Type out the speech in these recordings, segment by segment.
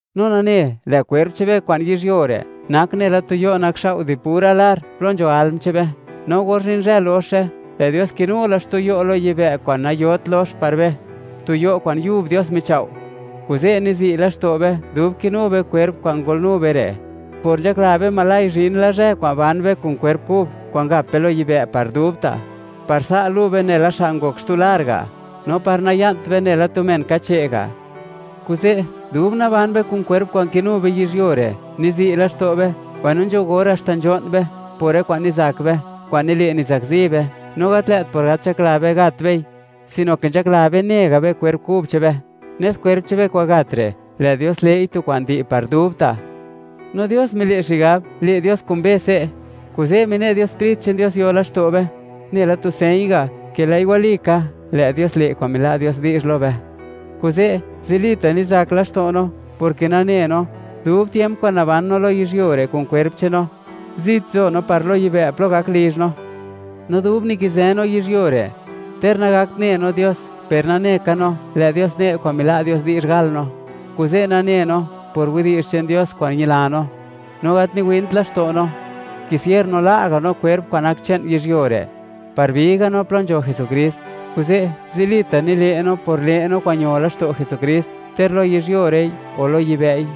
No nane, lë' kwerp che'n be kwa'n yizhyuo re' nak nela tu yo' nakxao' di pura lar, plo nzho alm che'n be, no or zhin zhë loxe, lë' Dios kinu la xtu yo' lo yibë' kwa'n nayot lox par be, tu yo' kwa'n yub Dios michao'. Kuze' nizi' laxto' be, dub kinu be kwerp kwa'n ngolnu be re', por nzhakla be oj zhin la zhë kwa'n ban be kun kwerp kub kwa'n gap be lo yibë' par dubta', par sa' lu' be nela men ngok xtu lar ga', no par naya'nt be nela tu men kache' ga'. Kuze', dub naban be kun kwerp kwa'n kinu be yizhyuo re', nizi' laxto' be, mbaino nzho gor haxta nzho'n be, por rë kwa'n nizak be, kwa'n nile', nizakzi be, no gat lë't por gat nzhakla be, gat bei, sino ke nzhakla be ne ga' be kwerp kub che'n be, nes par kwerp che'n be kwa'n gat re', lë' Dios le'i tu kwa'n di' par dubta'. No Dios mile' xigab, le' Dios kun be se', kuze', mine' Dios Sprit che'n Dios yo laxto' be, nela tu señ ga', ke lë'i walika, lë' Dios le' kwa'n mila' Dios di'zh lo be. Kuze', zilita' nizak laxto' no, porke nane no, dub tiemp kwa'n naban no lo yizhyuo re' kun kwerp che'n no, zit nzo no par lo yibë' plo gak lizh no. No dub nikizë no yizhyuo re', ter nagakt ne no Dios, per nane ka no, lë' Dios ne' kwa'n mila' Dios di'zh gal no. Kuze' nane no, por widi'zh che'n Dios kwa'n ñila no, no gat niwint laxto' no, kisier no la' ga' no kwerp kwa'n nak che'n yizhyuo re', par bi ga' no plo nzho Jesukrist. Kuze', zilita' nile' no por le' no kwa'n ño laxto' Jesukrist, ter lo yizhyuo re'i o lo yibë'i,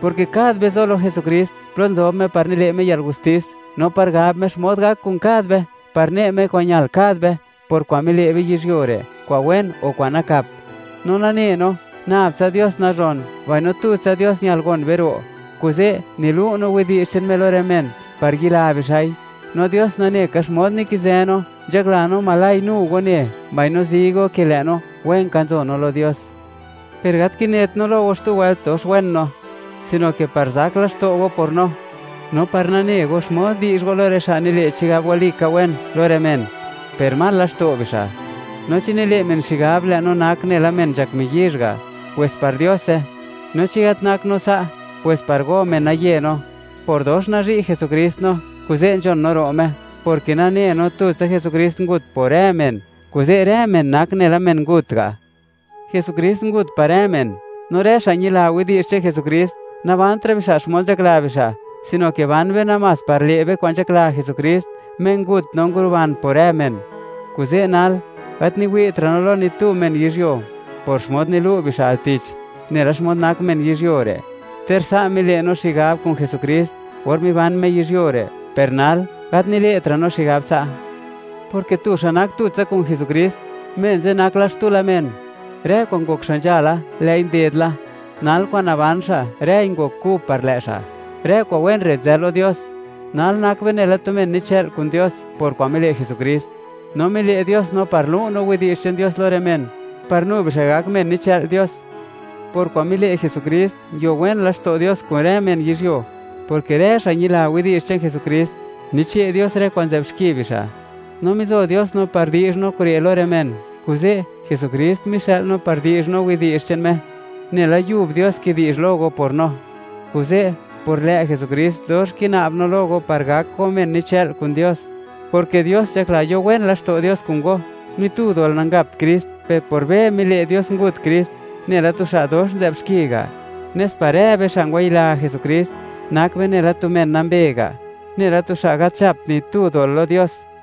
porke kad be, zo lo Jesukrist, plo nzob Me, par nile' Me yalgustis, no par gab Me xmod gak kun kad be, par ne' Me kwa'n ñal kad be, por kwa'n mile' be yizhyuo re', kwa'n wen o kwa'n nakap. No nane no, nab tsa Dios nazhon, mbaino tutsa Dios ñal gon be ro', kuze' nilu' no widi'zh che'n Me lo rë men, par yila bixa'i. No Dios nane ka xmod nikizë no, nzhakla no, oj nu go ne, mbaino zi go ke lë' no, wen ka nzo no lo Dios. Per gat kinet no lo go xtu wëlt, dox wen no, sino ke par zak laxto' go por no, no par nane go xmod di'zh go lo rë xa' nile' chigab walika wen, lo rë men, per mal laxto' bixa'. No chi nile' men xigab, lë' no nak nela men nzhak miyizh ga', pwes par Diose; no chi gat nak no sa', pwes par go, menaye no. Por dox nazhi' Jesukrist no, kuze' nzhon no ro' Me, porke nane no, tutsa Jesukrist ngut por rë men, kuze' rë men nak nela men ngut ga'. Jesukrist ngut par rë men, no rë xa' ñila widi'zh che'n Jesukrist, nabantra' bixa' xmod nzhakla bixa', sino ke ban be namás par le' be kwa'n nzhakla Jesukrist, Me ngut no nguruban por rë men. Kuze' nal, gat niwi'tra' no lo ni tu men yizhyuo por xmod nilu' bixa' al tich, nela xmod nak men yizhyuo re'. Ter sa' mile' no xigab kun Jesukrist, or miban Me yizhyuo re', per nal, gat nile'tra' no xigab sa', porke tu xa' nak tutsa kun Jesukrist, men ze' nak la xtu men; rë kwa'n ngok xa' nzhala, lë'i nded la; nal kwa'n naban xa', rëi ngok kub par lë' xa'. Rë kwa'n wen re' nzë lo Dios; nal nak be nela tu men nichë'l kun Dios por kwa'n mile' Jesukrist, no mile' Dios no par lu' no widi'zh che'n Dios lo rë men, par nu bixa' gak men nichë'l Dios. Por kwa'n mile' Jesukrist, nguio wen laxto' Dios kun rë men yizhyuo, porke rë xa' ñila widi'zh che'n Jesukrist, niche' Dios rë kwa'n nzë'b xki bixa', no mizo Dios no par di'zh no kure' lo rë men. Kuze', Jesukrist mixë'l no par di'zh no widi'zh che'n Me, nela yub Dios kidi'zh lo go por no. Kuze', por lë' Jesukrist, dox kina'b no lo go par gak go men nichë'l kun Dios, porke Dios nzhakla yo wen laxto' Dios kun go. Ni tu dol nangapt Krist, per por be, mile' Dios ngut Krist, nela tu xa' dox nzë'b xki ga', nes par rë be, xa' ngwayila Jesukrist, nak be nela tu men nambe ga', nela tu xa' gat nzhapt ni tu dol lo Dios.